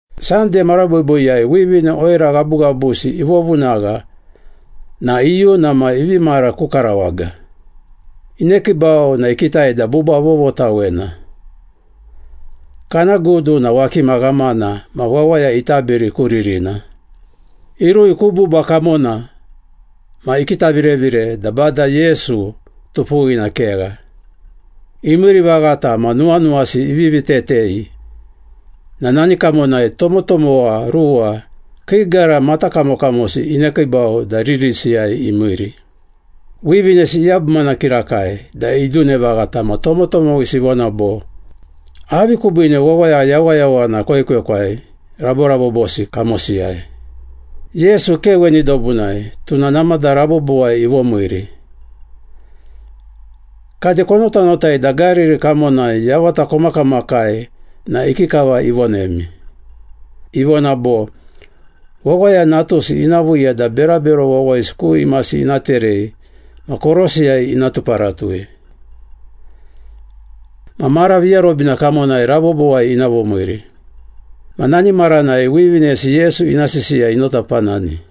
Sande mara boiboiyai wivine oira ghabughabusi ivovunagha na iyuna ma ivi mara ku karawaga. Inekiibau na ikitai da buba vovotawena. Kana gudu na wakima ghamana ma wawaya itabiri ku ririna. Irui ku buba kamona ma ikitavirevire da Bada Yesu tupuwina kegha. Imiiri vaghata ma nuwanuwasi ivivi tetei na nani kamonai tomotomowa ruwa, kii gara matakamokamosi inekiibau da ririsiyai imiiri. Wivinesi iyabumana kirakai da idune vaghata ma tomotomowisi ivona bo, “Avi kubiine wawaya yawayawana koekwekwai raborabobosi kamosiyai? Yesu ke weni dobunai, tuna namada rabobowai ivomiiri. Kade konotanotai da Gariri kamonai yavata komakamakai na ikikava ivonemi? Ivona bo, ‘Wawaya Natusi ina viiya da berabero wawayisi ku imasi ina terei ma korosiyai ina tuparatui. Ma mara viarobina kamonai rabobowai ina vomiiri.’” Ma nani maranai wivinesi Yesu ina sisiya inotapanani.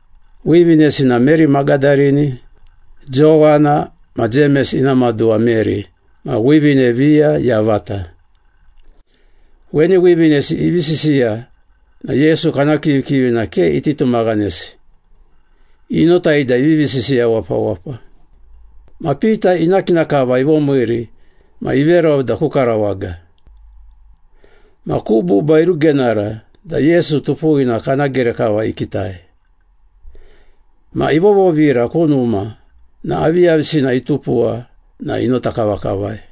Wivinesi na Meri Magadarini, Jowana ma Jemes ina maduwa Meri ma wivine viya yavata. Weni wivinesi ivi sisiya na Yesu kana kivikivina ke iti tumaghanesi, inotai da ivivi sisiya wapawapa. Ma Pita ina kina kava ivomiiri ma iverau da ku karawaga. Ma ku buba irugenara da Yesu tupuwina kana gere kava ikitai. Ma ivovovira ku numa ma aviyavisina itupuwa na inota kavakavai.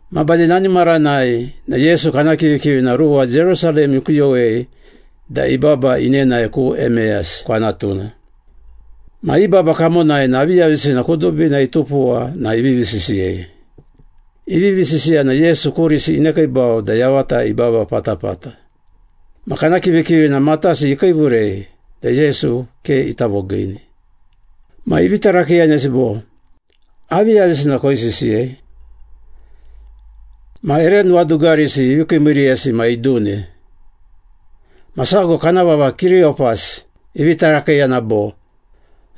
Ma bade nani maranai na Yesu kana kivikivina ruwa Jerusalem ikuyowei da ibaba inenae ku Emeyas kwanatuna. Ma i baba kamonai na aviyavisina kudubina itupuwa na ivivi sisiyei. Ivivi sisiya na Yesu kurisi inekiibau da yavata ibaba patapata. Ma kana kivikivina matasi ikiivurei da Yesu ke ita vogiini. Ma ivi tarakiiyanesi bo, “Aviyavisina koisisiyei?” Ma ere nuwadugarisi ivi kiimiiriyesi ma idune. Ma sago, kana vava Kiriyopas ivi tarakiiyana bo,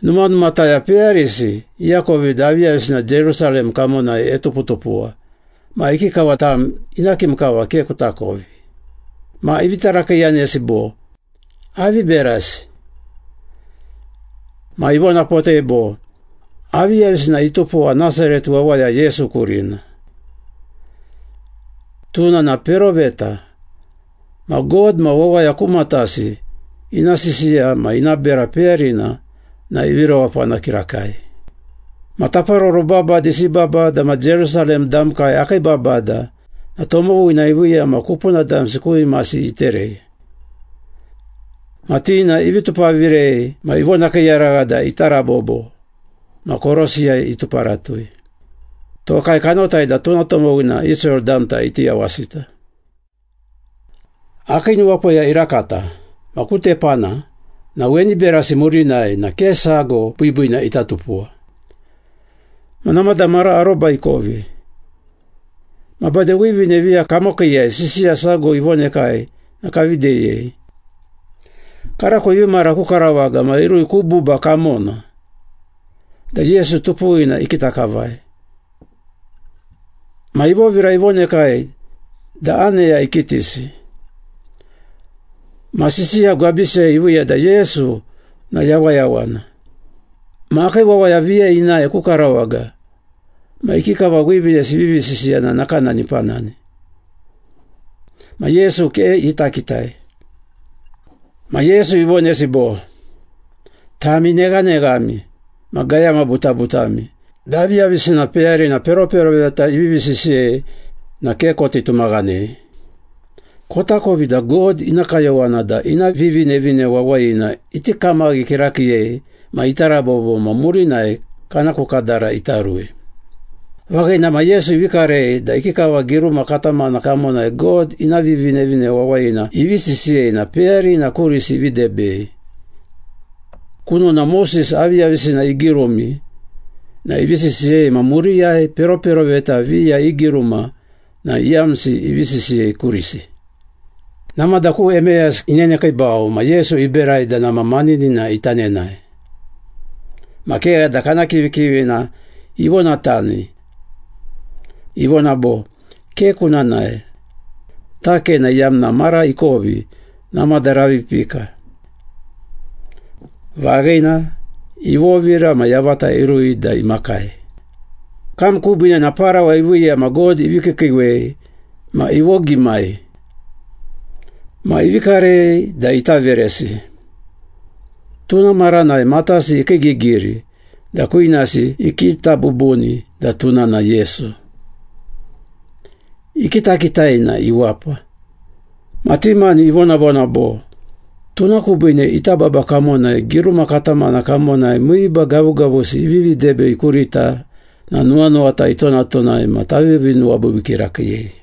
“Numanumataya peyarisi iakovi da aviyavisina Jerusalem kamonai etuputupuwa ma ikikava tam ina kim kava ke kutakovi?” Ma ivi tarakiiyanesi bo, “Avi berasi?” Ma ivonapotei bo, “Aviyavisina itupuwa Nasaret wawaya Yesu kurina. Tuna na peroveta ma God ma wawaya ku matasi ina sisiya ma ina bera peyarina na ivi rewapana kirakai. Ma taparoro babadisi i babada ma Jerusalem damkai akii babada na tomowina iviiya ma kupuna damsi ku imasi iterei. Ma ti na ivi tupavirei ma ivonakiiyaragha da ita rabobo ma korosiyai ituparatui. Tokai kanotai da tuna tomowina Israel damta iti yawasita. Akii nuwapoya irakata, ma ku tepana na weni berasi murinai na ke sago biibiina ita tupuwa. Ma namada mara aroba ikovi. Ma bade wivine viya kamokiiyai sisiya sago ivonekai na kavi deyei. Karako ivi mara ku karawaga ma irui ku buba kamona da Yesu tupuwina ikita kavai. Ma ivovira ivonekai da aneya ikitisi. Ma sisiya gwabisiyai iviiya da Yesu na yawayawana. Ma akii wawaya viya inae ku karawaga ma ikikava wivinesi ivivi sisiya na nakanani ipanani. Ma Yesu ke ita kitai.” Ma Yesu ivonesi bo, “Tami neghaneghami ma gayama butabutami da aviyavisina peyarina peroperoveta ivivi sisiyei na ke koti tumaghanei. Kotakovi da God ina kayowana da ina Vivinevine Wawayina iti kamaghi kirakiiyei ma ita rabobo ma murinai kana ku kadara ita rui.” Vaghina ma Yesu ivi karei da ikikava giruma katamana kamonai God ina Vivinevine Wawayina ivi sisiyei na peyarina kurisi ivi debei. Kunona Moses aviyavisina igirumi na ivi sisiyei ma muriyai peroperoveta viya i giruma na iyamsi ivi sisiyei kurisi. Namada ku Emeyas inenekiibau ma Yesu iberai da nama maninina ita nenae. Ma kegha da kana kivikivina ivonatani. Ivona bo, “Ke kuna nae. Takena iyamna mara ikovi, namada ravi ipika.” Vaghina, ivovira ma yavata irui da imakai. Kam kubiine na parawa iviiya ma God ivi kiikiiwei ma ivogimai. Ma ivi karei da ita veresi. Tuna maranai matasi ikiigigiri da kwinasi ikita bubuni da tuna na Yesu. Ikitakitai na iwapa. Ma ti mani ivonavona bo, “Tuna kubiine ita baba kamonai giruma katamana kamonai miiba gavugavusi ivivi debei kurita na nuwanuwata itonatonai ma tavivi nuwabiibii kirakiiyei.”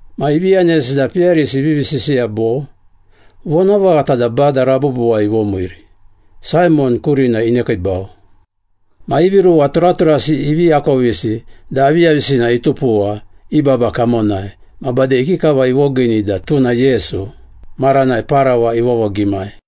Ma ivi yanesi da peyarisi ivivi sisiya bo, “Vonavaghata da Bada rabobowai ivomiiri! Saimon kurina inekiibau!” Ma ivi ruwa turaturasi ivi akovisi da aviyavisina tupuwa i baba kamonai, ma bade ikikava ivogiini da tuna Yesu, maranai parawa ivovogimai.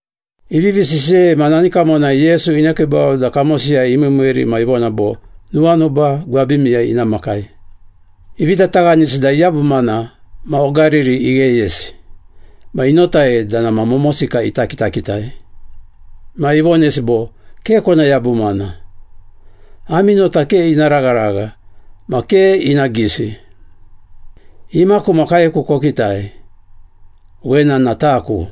Ivivi sisiyei ma nani kamonai Yesu inekiibau da kamosiyai imiimiiri ma ivona bo, “Nuwanuba gwabimiyai ina makai.” Ivi tataghanisi da iyabumana ma ogariri igheyesi ma inotai da nama momosika ita kitakitai. Ma ivonesi bo, “Ke kona yabumana. Ami nota ke ina ragharagha ma ke ina gisi. Imaku ma kaeku kokitai. Wena na taku!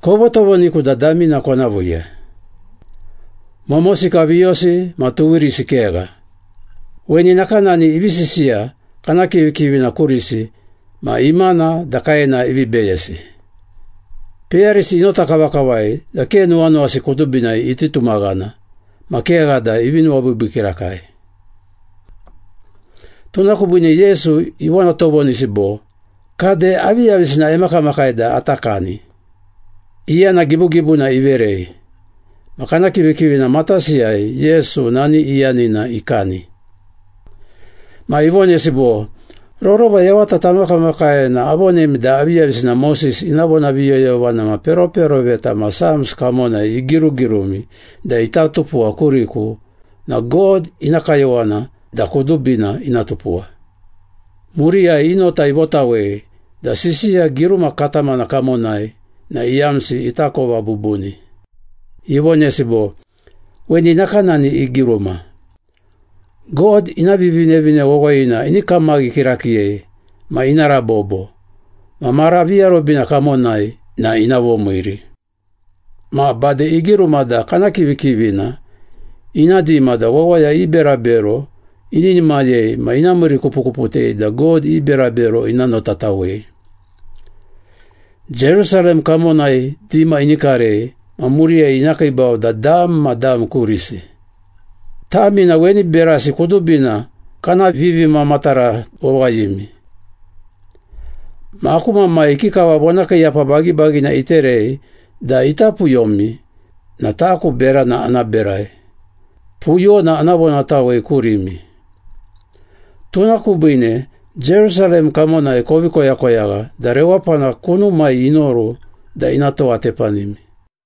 Kovotovoniku da damina kona viiya. Momosika viyosi ma tuwirisi kegha.” Weni nakanani ivi sisiya kana kivikivina kurisi ma imana da kaena ivi beyesi. Peyarisi inota kavakavai da ke nuwanuwasi kudubinai iti tumaghana ma kegha da ivi nuwabiibii kirakai. Tuna kubiine Yesu ivonatovonisi bo, “Kade, aviyavisina emakamakai da ata kani?” Iyana gibugibuna iverei, ma kana kivikivina matasiyai Yesu nani iyanina ikani. Ma ivonesi bo, “Rorova yavata tamakamakai na avonemi da aviyavisina Moses ina vonaviyoyovana ma peroperoveta ma Psalms kamonai igirugirumi da ita tupuwa kuriku na God ina kayowana da kudubina ina tupuwa.” Muriyai i nota ivotawei da sisiya giruma katamana kamonai na iyamsi itakova bubuni. Ivonesi bo, “Weni nakanani igiruma. ‘God ina Vivinevine Wawayina ini kamaghi kirakiiyei ma ina rabobo, ma mara viarobina kamonai na ina vomiiri.’ Ma bade igiruma da kana kivikivina ina dima da wawaya i berabero ininimayei ma ina miirikupukuputei da God i berabero ina notatawei. Jerusalem kamonai dima ini karei ma muriyai ina kiibau da dam ma dam kurisi. Tami na weni berasi kudubina kana vivimamatara wawayimi. Ma aku Mamai ikikava vonakiiyapa bagibagina iterei da ita puyomi na taku berana ana berai, puyona ana vonatawei kurimi. Tuna kubiine Jerusalem kamonai kovi koyakoyagha da rewapana kunumai inoru da ina towatepanimi.”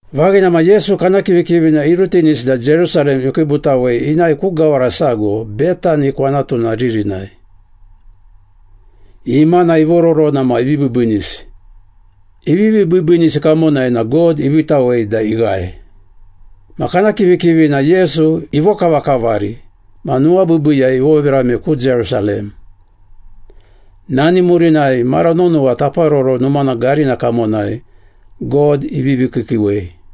Vaghina ma, Yesu kana kivikivina irutinisi da Jerusalem ikiibutawe inae ku gawara sago Betani kwanatuna ririnai. Imana ivororona ma ivi biibiinisi. Ivivi biibiinisi kamonai na God iviitawei da ighae. Ma kana kivikivina Yesu ivokavakavari ma nuwabiibiiyai ivovirame ku Jerusalem. Nani murinai mara nonowa Taparoro Numana garina kamonai God ivivi kiikiiwei.